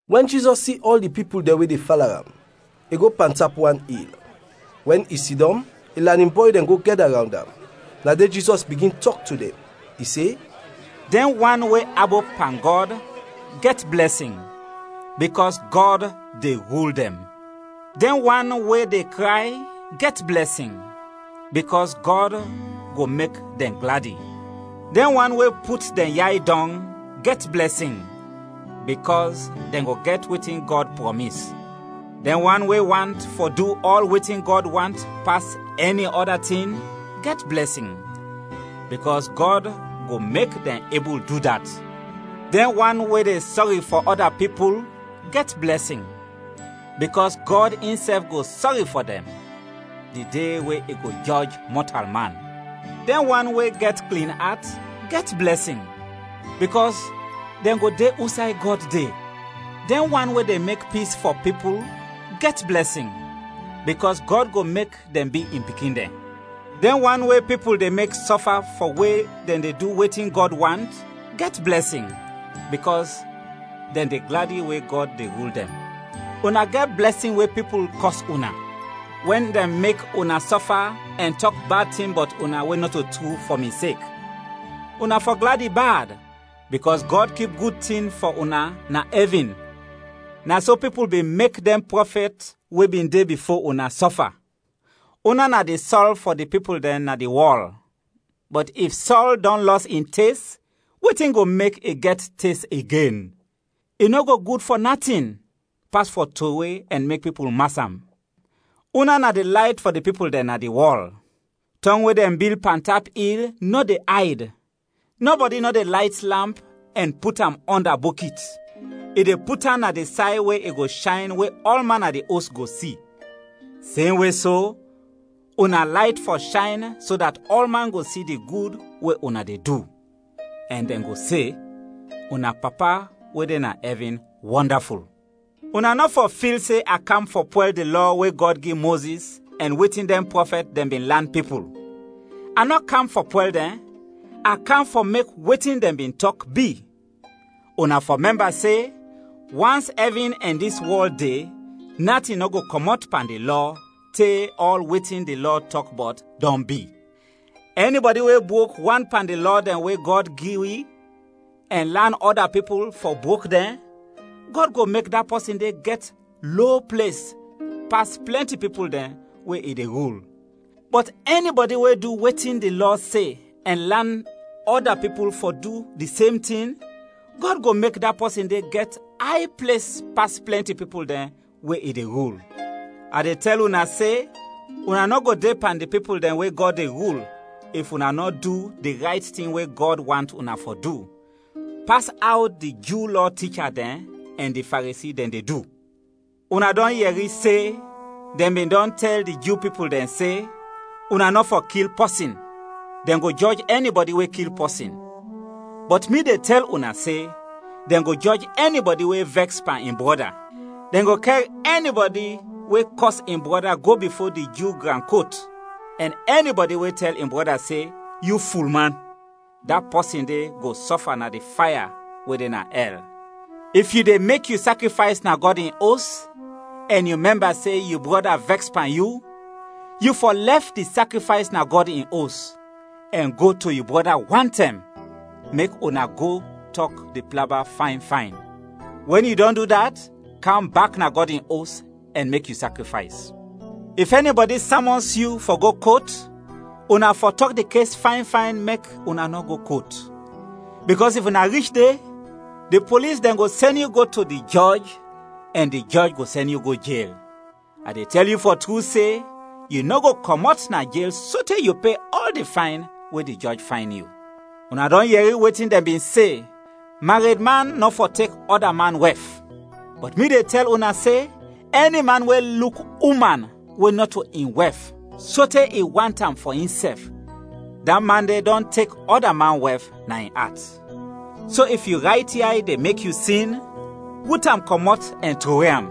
Wɛn Jizɔs si ɔl di pipul dɛn we de fala am, i go pantap wan il. Wɛn i sidɔm, in lanin bɔy dɛn go gɛda rawnd am. Na de Jizɔs bigin tɔk to dɛn, i se: “Dɛn wan we abop pan Gɔd, gɛt blɛsin, bikɔs Gɔd de rul dɛn! “Dɛn wan we de kray, gɛt blɛsin, bikɔs Gɔd go mek dɛn gladi! “Dɛn wan we put dɛn yay dɔng, gɛt blɛsin, bikɔs dɛn go gɛt wetin Gɔd prɔmis! “Dɛn wan we want fɔ du ɔl wetin Gɔd want pas ɛni ɔda tin, gɛt blɛsin, bikɔs Gɔd go mek dɛn ebul du dat! “Dɛn wan we de sɔri fɔ ɔda pipul, gɛt blɛsin, bikɔs Gɔd insɛf go sɔri fɔ dɛn di de we i go jɔj mɔtalman! “Dɛn wan we gɛt klin at, gɛt blɛsin, bikɔs dɛn go de usay Gɔd de! “Dɛn wan we de mek pis fɔ pipul, gɛt blɛsin, bikɔs Gɔd go mek dɛn bi in pikin dɛn! “Dɛn wan we pipul de mek sɔfa fɔ we dɛn de du wetin Gɔd want, gɛt blɛsin, bikɔs dɛn de gladi we Gɔd de rul dɛn! “Una gɛt blɛsin wɛn pipul kɔs una, wɛn dɛn mek una sɔfa ɛn tɔk bad tin bɔt una we nɔto tru, fɔ mi sek. Una fɔ gladi bad, bikɔs Gɔd kip gud tin fɔ una na ɛvin. Na so pipul bin mek dɛn prɔfɛt we bin de bifo una, sɔfa. “Una na di sɔl fɔ di pipul dɛn na di wɔl, bɔt if sɔl dɔn lɔs in tes, wetin go mek i gɛt tes igen? I nɔ go gud fɔ natin, pas fɔ trowe ɛn mek pipul mas am. “Una na di layt fɔ di pipul dɛn na di wɔl. Tɔng we dɛn bil pantap il nɔ de ayd. Nɔbɔdi nɔ de layt lamp ɛn put am ɔnda bɔkit, i de put am na di say we i go shayn we ɔlman na di os go si. Semwe so, una layt fɔ shayn so dat ɔlman go si di gud we una de du, ɛn dɛn go se, ‘Una Papa, we de na ɛvin, wɔndaful!’ “Una nɔ fɔ fil se a kam fɔ pwɛl di Lɔ we Gɔd gi Mozis ɛn wetin dɛn prɔfɛt dɛn bin lan pipul. A nɔ kam fɔ pwɛl dɛn, a kam fɔ mek wetin dɛn bin tɔk, bi. Una fɔ mɛmba se, wans ɛvin ɛn dis wɔl de, natin nɔ go kɔmɔt pan di Lɔ te ɔl wetin di Lɔ tɔk bɔt, dɔn bi. Ɛnibɔdi we brok wan pan di lɔ dɛn we Gɔd gi wi, ɛn lan ɔda pipul fɔ brok dɛn, Gɔd go mek da pɔsin de gɛt lo ples pas plɛnti pipul dɛn we i de rul; bɔt ɛnibɔdi we du wetin di Lɔ se ɛn lan ɔda pipul fɔ du di sem tin, Gɔd go mek da pɔsin de gɛt ay ples pas plɛnti pipul dɛn we i de rul. A de tɛl una se, una nɔ go de pan di pipul dɛn we Gɔd de rul, if una nɔ du di rayt tin we Gɔd want una fɔ du, pas aw di Ju Lɔ ticha dɛn ɛn di Faresi dɛn de du. “Una dɔn yɛri se, dɛn bin dɔn tɛl di Ju pipul dɛn se, ‘Una nɔ fɔ kil pɔsin; dɛn go jɔj ɛnibɔdi we kil pɔsin.’ Bɔt mi de tɛl una se: dɛn go jɔj ɛnibɔdi we vɛks pan in brɔda. Dɛn go kɛr ɛnibɔdi we kɔs in brɔda go bifo di Ju gran kot, ɛn ɛnibɔdi we tɛl in brɔda se, ‘Yu fulman!’ da pɔsin de go sɔfa na di faya we de na ɛl. If yu de mek yu sakrifays na Gɔd in Os, ɛn yu mɛmba se yu brɔda vɛks pan yu, yu fɔ lɛf di sakrifays na Gɔd in Os, ɛn go to yu brɔda wantɛm, mek una go tɔk di plaba fayn fayn. Wɛn yu dɔn du dat, kam bak na Gɔd in Os ɛn mek yu sakrifays. “If ɛnibɔdi samɔns yu fɔ go kot, una fɔ tɔk di kes fayn fayn mek una nɔ go kot. Bikɔs if una rich de, di polis dɛn go sɛn yu to di jɔj ɛn di jɔj go sɛn yu go jel. A de tɛl yu fɔ tru se, yu nɔ go kɔmɔt na jel sote yu pe ɔl di fayn we di jɔj fayn yu. “Una dɔn yɛri wetin dɛn bin se, ‘Maredman nɔ fɔ tek ɔda man wɛf.’ Bɔt mi de tɛl una se: ɛni man we luk uman, we nɔto in wɛf, sote i want am fɔ insɛf, da man de dɔn tek ɔda man wɛf na in at. So if yu rayt yay de mek yu sin, rut am kɔmɔt ɛn trowe am!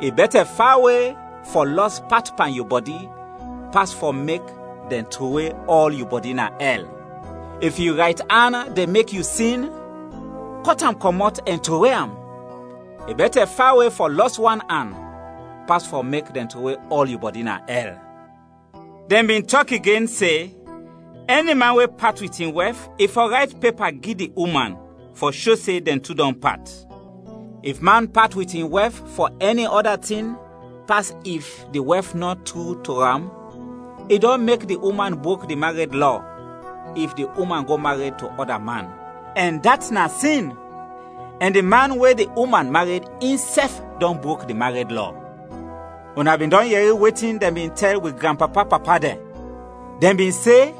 I bɛtɛ fawe fɔ lɔs pat pan yu bɔdi, pas fɔ mek dɛn trowe ɔl yu bɔdi na ɛl. If yu rayt an de mek yu sin, kɔt am kɔmɔt ɛn trowe am! I bɛtɛ fawe fɔ lɔs wan an, pas fɔ mek dɛn trowe ɔl yu bɔdi na ɛl. “Dɛn bin tɔk igen se, ‘Ɛni man we pat wit in wɛf, i fɔ rayt pepa gi di uman fɔ sho se dɛn tu dɔn pat.’ If man pat wit in wɛf fɔ ɛni ɔda tin pas if di wɛf nɔ tru to am, i dɔn mek di uman brok di mared lɔ if di uman go mared to ɔda man, ɛn dat na sin; ɛn di man we di uman mared insɛf dɔn brok di mared lɔ. “Una bin dɔn yɛri wetin dɛn bin tɛl wi granpapa-papa dɛn. Dɛn bin se,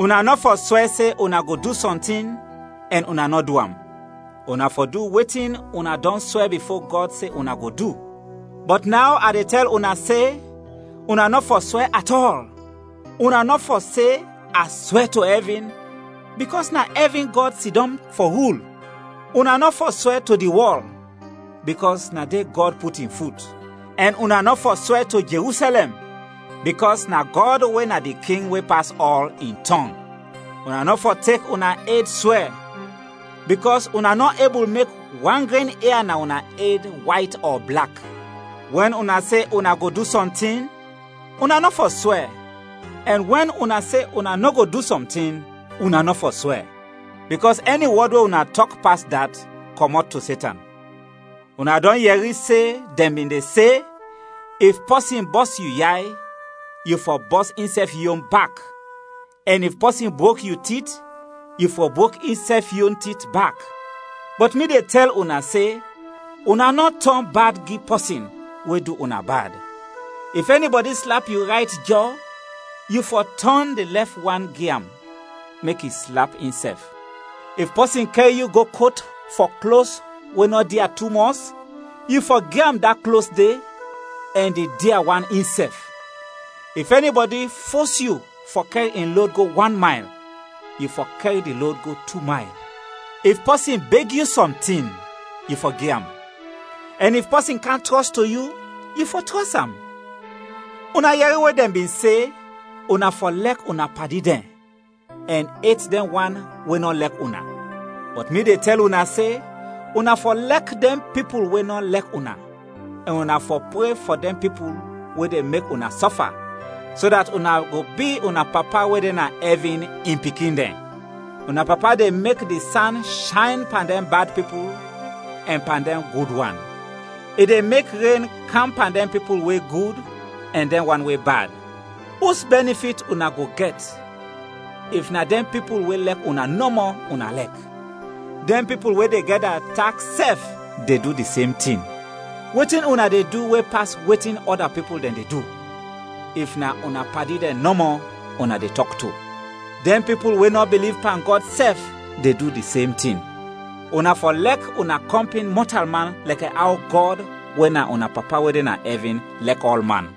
‘Una nɔ fɔ swɛ se una go du sɔntin, ɛn una nɔ du am. Una fɔ du wetin una dɔn swɛ bifo Gɔd se una go du.’ Bɔt naw a de tɛl una se: Una nɔ fɔ swɛ at ɔl, una nɔ fɔ se a swɛ to ɛvin, bikɔs na ɛvin Gɔd sidɔm fɔ rul. Una nɔ fɔ swɛ to di wɔl, bikɔs na de Gɔd put in fut; ɛn una nɔ fɔ swɛ to Jerusɛlɛm, bikɔs na Gɔd, we na di king we pas ɔl, in tɔng. Una nɔ fɔ tek una ed swɛ, bikɔs una nɔ ebul mek wan gren ia na una ed wayt ɔ blak. Wɛn una se una go du sɔntin, una nɔ fɔ swɛ, ɛn wɛn una se una nɔ go du sɔntin, una nɔ fɔ swɛ. Bikɔs ɛni wɔd we una tɔk pas dat kɔmɔt to Setan. “Una dɔn yɛri se dɛn bin de se, ‘If pɔsin bɔs yu yay, yu fɔ bɔs insɛf yon bak, ɛn if pɔsin brok yu tit, yu fɔ brok insɛf yon tit bak.’ Bɔt mi de tɛl una se: una nɔ tɔn bad gi pɔsin we du una bad. If ɛnibɔdi slap yu rayt jɔ, yu fɔ tɔn di lɛf wan gi am mek i slap insɛf. If pɔsin kɛr yu go kot fɔ klos we nɔ dia tumɔs, yu fɔ gi am da klos de, ɛn di dia wan insɛf. If ɛnibɔdi fos yu fɔ kɛr in lod go wan mayl, yu fɔ kɛr di lod go tu mayl. If pɔsin beg yu sɔntin, yu fɔ gi am, ɛn if pɔsin kam trɔs to yu, yu fɔ trɔs am. “Una yɛri we dɛn bin se, ‘Una fɔ lɛk una padi dɛn, ɛn et dɛn wan we nɔ lɛk una.’ Bɔt mi de tɛl una se: una fɔ lɛk dɛn pipul we nɔ lɛk una, ɛn una fɔ pre fɔ dɛn pipul we de mek una sɔfa, so dat una go bi una Papa, we de na ɛvin, in pikin dɛn. Una Papa de mek di san shayn pan dɛn bad pipul ɛn pan dɛn gud wan. I de mek ren kam pan dɛn pipul we gud ɛn dɛn wan we bad. Us bɛnifit una go gɛt if na dɛn pipul we lɛk una nɔmɔ una lɛk? Dɛn pipul we de gɛda taks sɛf de du di sem tin. Wetin una de du we pas wetin ɔda pipul dɛn de du, if na una padi dɛn nɔmɔ una de tɔk to? Dɛn pipul we nɔ biliv pan Gɔd sɛf de du di sem tin. Una fɔ lɛk una kɔmpin mɔtalman lɛkɛ aw Gɔd, we na una Papa we de na ɛvin, lɛk ɔlman.